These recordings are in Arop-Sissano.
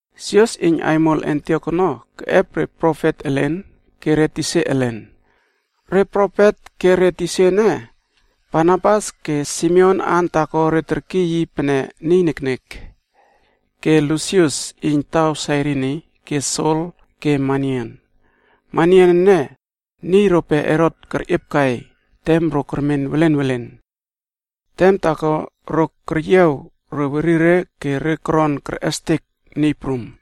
Sios iyn aimol Antiok ono keꞌep re profet elen ke re tisa elen. Re profet ke re tisa ene, Barnabas ke simeon aan taako re terkiyna yi pene, niy elin kenek. Ke Lusius iyn taw Sairini ke Sol ke Manain. (Manain ene, niy rope Herot kerꞌiepkai tem ro kermen welen welen). Tem taako re keryiaw re werire ke re koron kerꞌestek Niy Prum.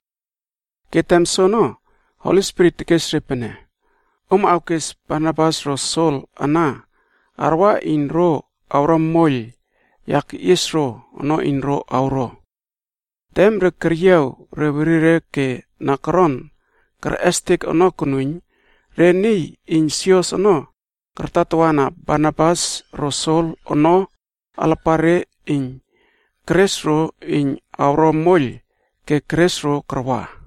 Ke tem soono, Holi Spirit tekes re pene, “Om awkes Barnabas ro Sol ana, arwa iyn ro awro moiyl ya keꞌies ro ono iyn ro awro.” Tem re keryiaw re werire ke na koron kerꞌestek ono konuiyn, re niy iyn sios ono kartatawana Barnabas ro Sol ono alapare iyn kerꞌes ro iyn awro moiyl ke keres ro karwa.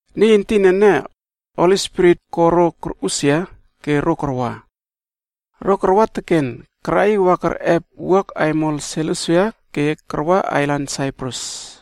Niy entin ene, Holi Spirit ko ro korꞌusia ke ro karwa. Ro karwa teken, karaꞌiw wa kerꞌep wuak aimol Selusia ke karwa ailan Saiprus.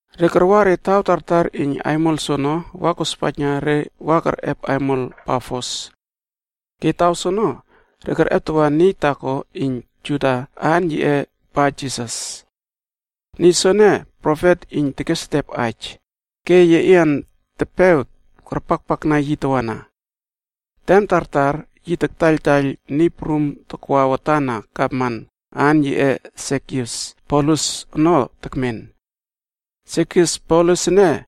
Re karwa re taw tartar iyn ailan soono wa kospaijna re wa kerꞌep aimol Pafos. Ke taw soono re kerꞌeptawa niy taako iyn Juda aan yiꞌe Barjisas. Niy soene, profet iyn tekesetep aij, ke yeꞌian tepew karpakpakna yi tawana. Tem tartar yi taktaiyl niy prum takwa watan na Gavman, aan yiꞌe Segius Paulus ono tekmen. Segius Paulus ene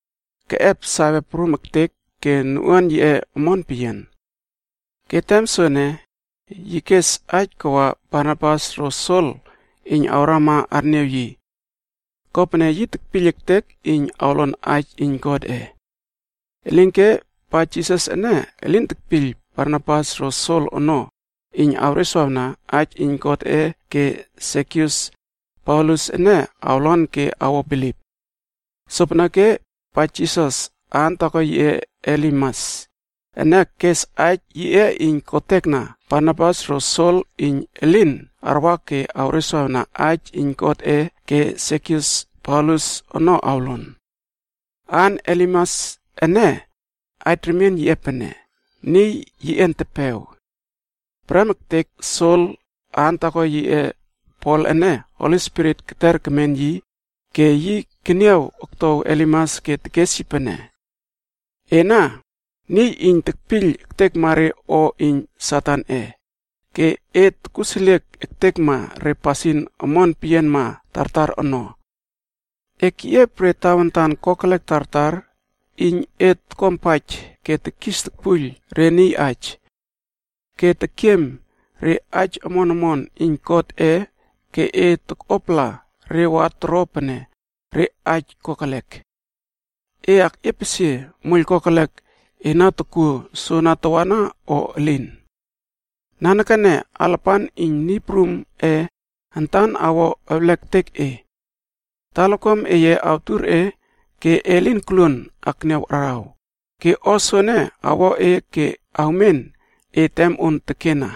keꞌep sawe prum ektek ke noꞌuan yiꞌe omon peyian. Ke tem soene, yi kes aij kawa Barnabas ro Sol iyn awrama arniaw yi. Kopene yi tekpiyl ektek iyn awlon aij iyn Godꞌe. Elinke, Barjisas ene elin kepiyl Barnabas ro Sol ono, iyn awreswawna Aij Iyn Godꞌe ke Segius Paulus ene awlon ke awo bilip. Sopeneke, Barjisas (aan taako yiꞌe Elimas) ene kes aij yiꞌe iyn kotekna Barnabas ro Sol iyn elin arwa ke awreswawna Aij Iyn Godꞌe ke Segius Paulus ono awlon. Aan Elimas ene, aij remien yiꞌe pene, “niy yeꞌian tepew.” Prem ektek Sol, aan taako yiꞌe Pol ene, Holi Spirit keter kemen yi ke yi keniaw oktow Elimas ke tekes yi pene, “Ena niy iyn tekpiyl ektekma re o iyn Satanꞌe, ke e tokuseliek ektekma re pasin merꞌer peyianma tartar ono! E keꞌiep re tawantan kokelek tartar iyn e tokuampaij ke tekis tokpuiyl re niy aij. E tekiem re aij omon omon iyn Niy Prumꞌe ke e takꞌuapala re wa toro pene re aij kokelek. E akꞌiepesie moiyl kokelek e na tokuo soana tawana o elin? Nanekene alapan iyn Niy Prumꞌe antan awo ewlek ektek e. Talakuam eye awtur e ke e lin koluon akniaw araw, ke o soene awo e ke awmen e tem on tekena.”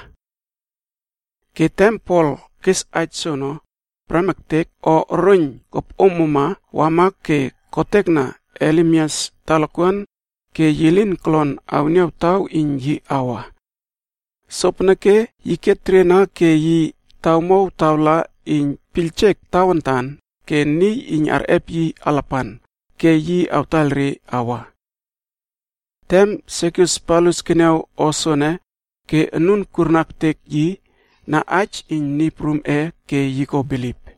Ke tem Pol kes aij soono, prem ektek o oroiyn kopꞌomomna wama ke kotekna Elimas talakuan ke yi lin kolon awniaw taw iyn yi awa. Sopeneke yi keteriena ke yi tawmow tawla iyn piyljek tawantan ke niy iyn arꞌep yi alapan, ke yi awtaiyl re awa. Tem Segius Paulus keniaw o soene ke anun kurna ektek yi na aij iyn Niy Prumꞌe ke yi ko bilip.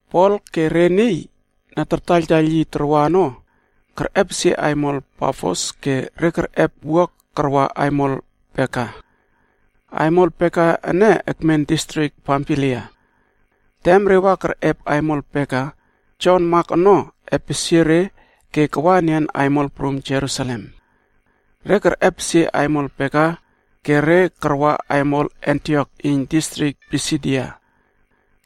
Pol ke re niy na tartaiyltaiyl yi tarwa ono kerꞌepesie aimol Pafos ke re kerꞌep wuak karwa aimol Perga. Aimol Perga ene ekmen distrik Pamfilia. Tem re wa kerꞌep aimol Perga, Jon Mak ono, epesie re ke kawa enian aimol prum Jerusalem. Re kerꞌepesie aimol Perga ke re karwa aimol Antiok iyn Distrik Pisidia.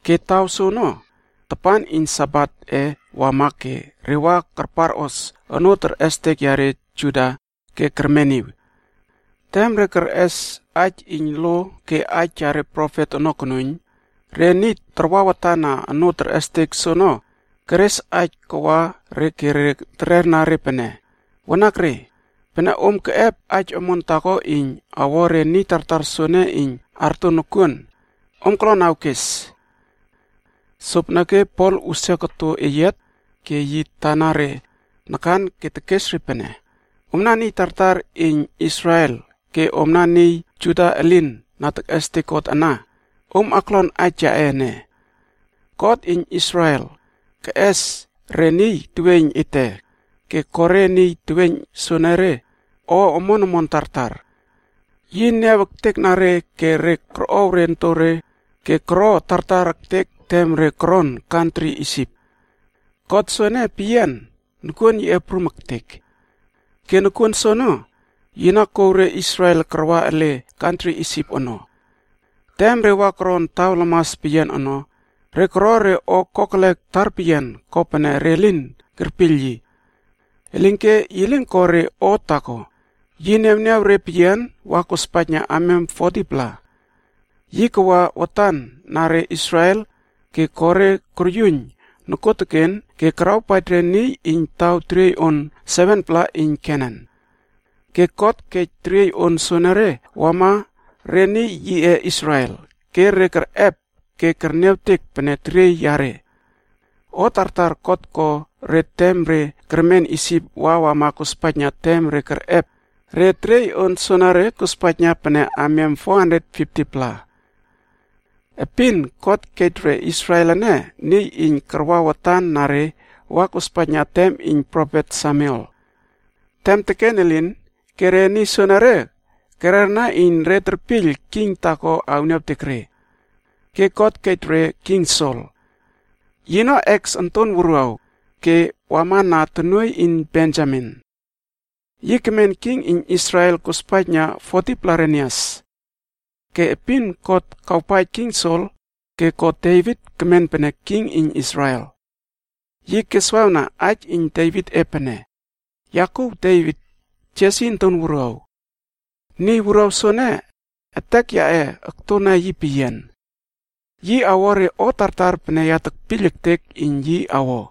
Ke taw soono, tapan iyn Sabat e wama ke re wa karparꞌos onoo terꞌestek yare Juda ke kermeniw. Tem re kerꞌes aij iyn lo ke aij yare profet ono konuiyn, re niy tarwa watan na onoo terꞌestek soono keres aij kawa re ke re terera re pene, “Wanakre, pene om keꞌep aij omon taako iyn awo re niy tartar soene iyn arto nokuon, om kolon awkes.” Sopeneke Pol usia koto eyiat ke yi tana re nakan ke tekes re pene, “Omna niy tartar iyn Israel ke omna niy Juda elin na tekꞌestek God ana, om aklon aij yaꞌe ene! God iyn Israel ono, keꞌes re niy teweiyn ete ke ko re niy teweiyn soenere o omon omon tartar. Yi niaw ektekna re ke re korꞌow re ontore wa koro tartar peyian tem re koron teriey iyn kantri Isip ono. God soene peyian, nokuon yiꞌe prum ektek. Ke nokuon soono, yi na kouw re Israel karwa ele teriey iyn kantri Isip ono. Tem re wa koron taw lamas peyian ono, re koro re o kokelek tarpeyian kopene re lin kerpiyl yi. Elinke yi lin ko re o taako, yi niawniaw re peyian wa kospaijna amiam 40-pla. Yi kawa watan na re Israel ke ko re koryuiyn nokuoteken ke karawpaij re niy iyn taw teriey on 7-pla iyn Kenan. Ke God kej teriey on soonore wama re niy yiꞌe Israel, ke re kerꞌep ke kerniawtek pene teriey yare. O tartar God ko re tem re kermen Isip wa wama kospaijna tem re kerꞌep re teriey on soenere kospaijna pene amiam 450-pla. “Epin God kej re Israel ene niy iyn karwa watan na re wa kospaijna tem iyn profet Samuel. Tem teken elin, ke re niy soenere kererna iyn re terpiyl king taako awniawtek re. Ke God kej re king Sol. Yino Kis onton wuruaw ke wama na tonuoiy iyn Benjamin. Yi kemen king iyn Israel kospaijna 40-pla renias. Ke epin God kawpaij king Sol, ke ko Devit kemen pene king iyn Israel. Yi keswawna aij iyn Devitꞌe pene, ‘Ya kuw Devit, Jesi onton wuruaw. Niy wuruaw soene, etek yaꞌe oktona yi peyian. Yi awo re o tartar pene ya tekpiyl ektek iyn yi awo.’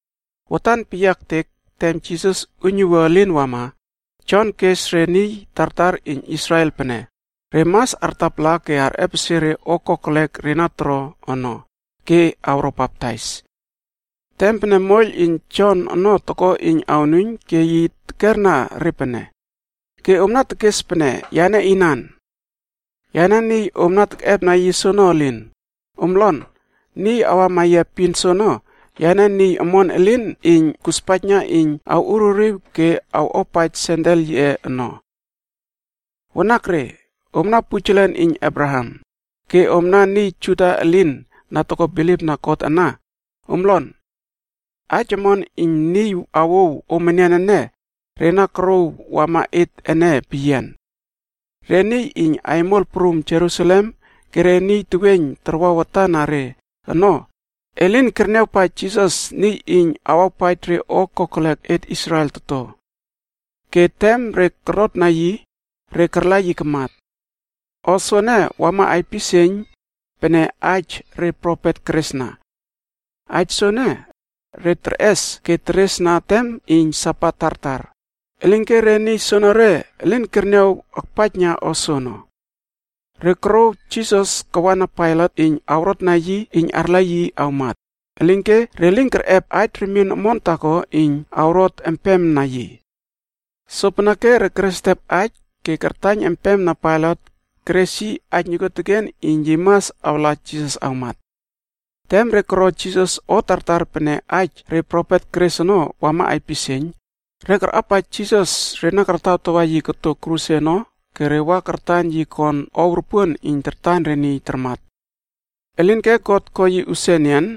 Watan peyia ektek tem Jisas uiynuwua elin wama, Jon kes re niy tartar iyn Israel pene re mas artapala ke arꞌepesie re o kokelek re na toro ono, ke awro baptais. Tem pene moiyl iyn Jonꞌe ono toko iyn awnuiyn ke yi tekerna re pene, ‘Ke omna tekes pene yane inan? Yane niy om na tekꞌepna yi soono elin. Om lon, niy awama yia epin soono, yane niy omon elin iyn kuspaijna iyn awꞌuririw ke awꞌuapaij sendel yiꞌe ono.a’ “Wanakre! Omna pujelen iyn Abraham, ke omna niy Juda elin na toko bilipna God ana, om lon! Aij omon iyn niy awouw om enian ene, re na korouw wama et ene peyian. Re niy iyn aimol prum Jerusalem ke re niy teweiyn tarwa watan na re ono, elin kerniawpaij Jisas niy iyn awawpaij re o kokelek et Israel toto. Ke tem re korotna yi, re karla yi kamat. O soene wama aipisieiyn pene aij re profet keresna. Aij soene, re terꞌes ke teresna tem iyn Sabat tartar, elinke re niy soonore elin kerniaw akpaijna o soono. Re korouw Jisas kawana Pailat iyn awrotna yi iyn arla yi awmat, elinke re lin kerꞌep aij remien omon taako iyn awrot empema yi. Sopeneke re keresetep aij ke kartaiyn empema Pailat keres yi aij nokuoteken iyn yi mas awla Jisas awmat. Tem re koro Jisas o tartar pene aij re profet keres ono wama aipisieiyn, re karꞌapaij Jisas re na kartawtawa yi koto kruse ono ke re wa kartan yi kon ow ropuon iyn tartan re niy tarmat. Elinke God ko yi usia enian.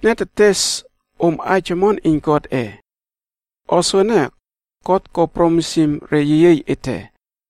“Etne tetes om aij omon iyn Godꞌe. O soene, God kespaij re yeyiey ete ono.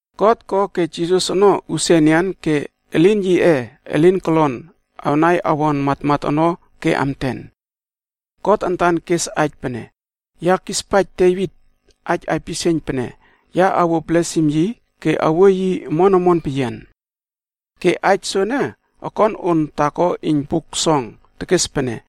God ko ke Jisas ono awꞌusia enian ke elin yiꞌe elin kolon awnai awon matmat ono ke amten. God antan kes aij pene, ‘Ya kispaij Devit aij aipisieiyn pene ya awuo blesim yi ke awuo yi omon omon peyian.’ Ke aij soene okon on taako iyn Buk Song tekes pene,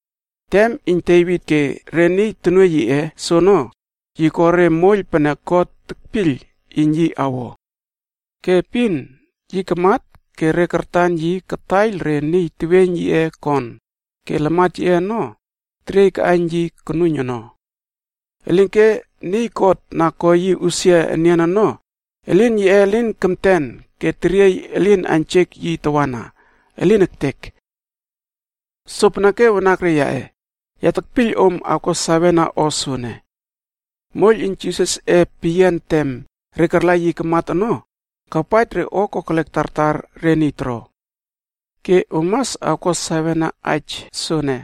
“Tem iyn Devit ke re niy tonuoiy yiꞌe soono, yi ko re moiyl pene God kepiyl iyn yi awo. Ke epin yi kamat ke re kartan yi kataiyl re niy teweiyn yiꞌe kon ke lamat yiꞌe ono teriey kaꞌaiyn yi konuiyn ono. Elinke niy God na ko yi usia enian ono, elin yiꞌe elin kemten ke teriey elin aiynjek yi tawana. Elin ektek! “Sopeneke wanakre yaꞌe, ya tekpiyl om awko sawena o soene. Moiyl iyn Jisasꞌe peyian tem re karla yi kamat ono, kawpaij re o kokelek tartar re niy toro. Ke om mas awko sawena aij soene,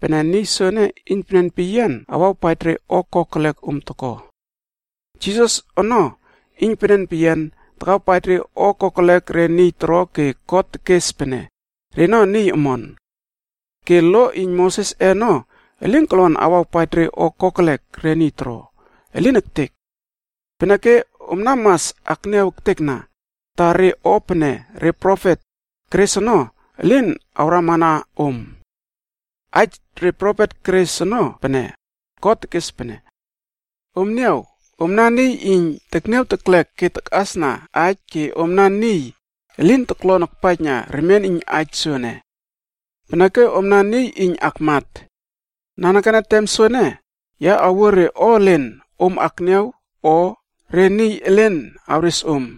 pene niy soene iynpenen awawpaij re o kokelek om toko. Jisas ono iynpenen peyian takawpaij re o kokelek re niy toro ke God tekes pene reno niy omon. Ke lo iyn Mosesꞌe ono elin kolon awawpaij re o kokelek re niy toro. Elin ektek! Peneke omna mas akniaw ektekna, ta re o pene re profet keres ono, elin awrama na om. Aij re profet keres ono pene, God tekes pene, ‘Om niaw, omna niy iyn tekniaw teklek ke takꞌasna aij ke omna niy elin toklon akpaijna remien iyn aij soene. Peneke omna niy iyn akmat. Nanekene tem soene, ya awuo re o elen om akniaw o re niy elen awres om,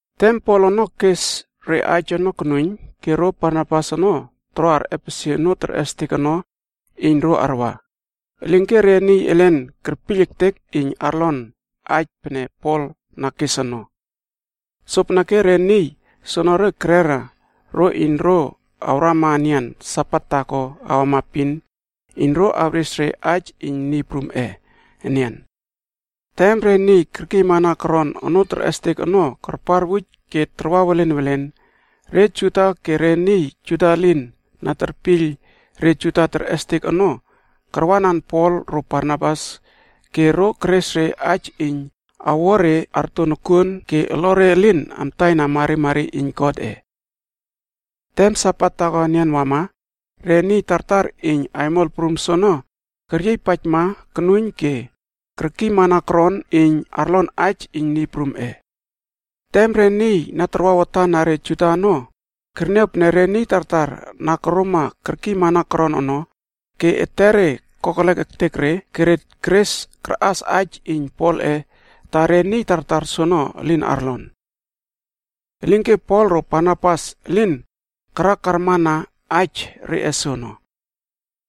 Tem Pol ono kes re aij ono konuiyn ke ro Barnabas ono toro arꞌepesie onoo terꞌestek ono iyn ro arwa, elinke re niy elen kerpiyl ektek iyn arlon aij pene Pol na kes ono. Sopeneke re niy soonore kerera ro iyn ro awrama enian Sabat taako awama epin iyn ro awres re aij iyn Niy Prumꞌe enian. Tem re niy kerkiyma koron onoo terꞌestek ono karparwuj ke tarwa welen welen, re Juda ke re niy Juda elin na tartaiyl re Juda terꞌestek ono karwanan Pol ro Barnabas ke ro keres re aij iyn awo re arto nokuon ke olore elin amtaina marimari iyn Godꞌe. Tem Sabat taako enian wama, re niy tartar iyn aimol prum soono keryiypaijma konuiyn ke kerkiymana koron iyn arlon aij iyn Niy Prumꞌe. Tem re niy na tarwa watan na re Juda ono kerniaw re niy tartar na koroma kerkiymana koron ono, ke etere kokelek ektek re ke re keres karꞌas aij iyn Polꞌe ta re niy tartar soono elin arlon. Elinke Pol ro Barnabas elin karakarmana aij reꞌe soono.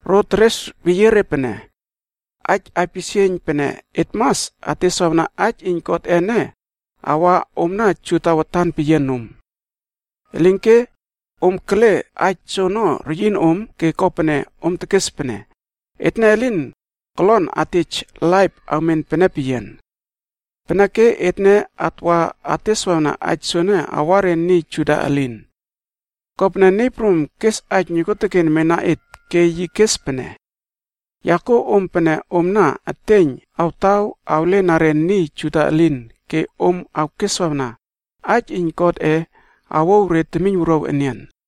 Ro teres weyie re pene, “Aij aipisieiyn pene et mas ateswawna aij iyn Godꞌe ene awa omna Juda watan peyian nom. Elinke om kele aij soono reyin om ke kopene om tekes pene, ‘Etne elin kolon atej laip awmen pene peyian.’ Peneke etne atwa ateswawna aij soene awa re niy Juda elin. Kopene Niy Prum kes aij nokuoteken mena et, ke yi kes pene, ‘Ya kuo om pene omna eteiyn awtaw awlena re niy Juda elin ke om awkeswawna aij iyn God awouw re temiynwuruaw enian.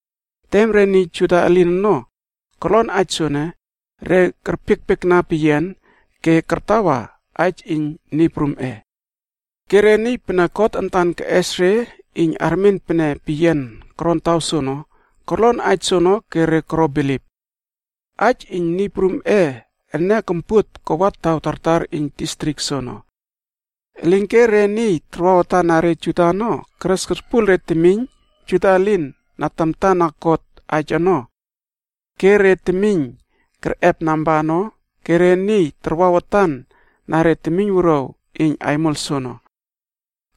Tem re niy Juda elin ono korlon aij soene, re kerpiekpiekna peyian ke kartawa aij iyn Niy Prumꞌe. Ke re niy pene God antan keꞌes re iyn armen pene peyian koron taw soono, korlon aij soono ke re koro bilip. Aij iyn Niy Prumꞌe ene kompuot kawa taw tartar iyn distrik soono. Elinke re niy tarwa watan na re Juda ono keres korpuiyl re temiyn Juda na tamta na God, aij ono. Ke re temiyn kerꞌep namba ono ke re niy tarwa watan na re temiynwuruaw iyn aimol soono.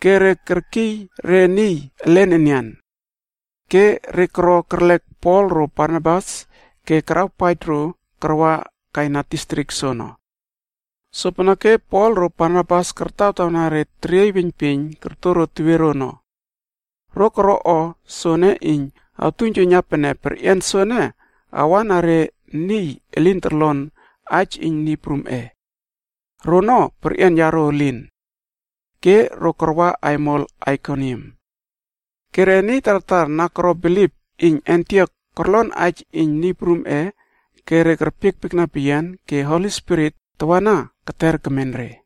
Ke re keryiy re niy elen enian. Ke re koro kerlek Pol ro Barnabas ke karawpaij ro karwa kaina distrik soono. Sopeneke Pol ro Barnabas kartawtawna re teriey weiynpieiyn koto ro tewiero ono. Ro koro o soene iyn awtuiynjuiyna pene perꞌian soene awa na re niy elin torlon aij iyn Niy Prumꞌe. Rono perꞌian yaro elin. Ke ro karwa aimol Aikonium. Ke re niy tartar na koro bilip iyn Antiok korlon aij iyn Niy Prumꞌe ke re kerpiekpiekna peyian ke Holi Spirit tawana keter kemen re.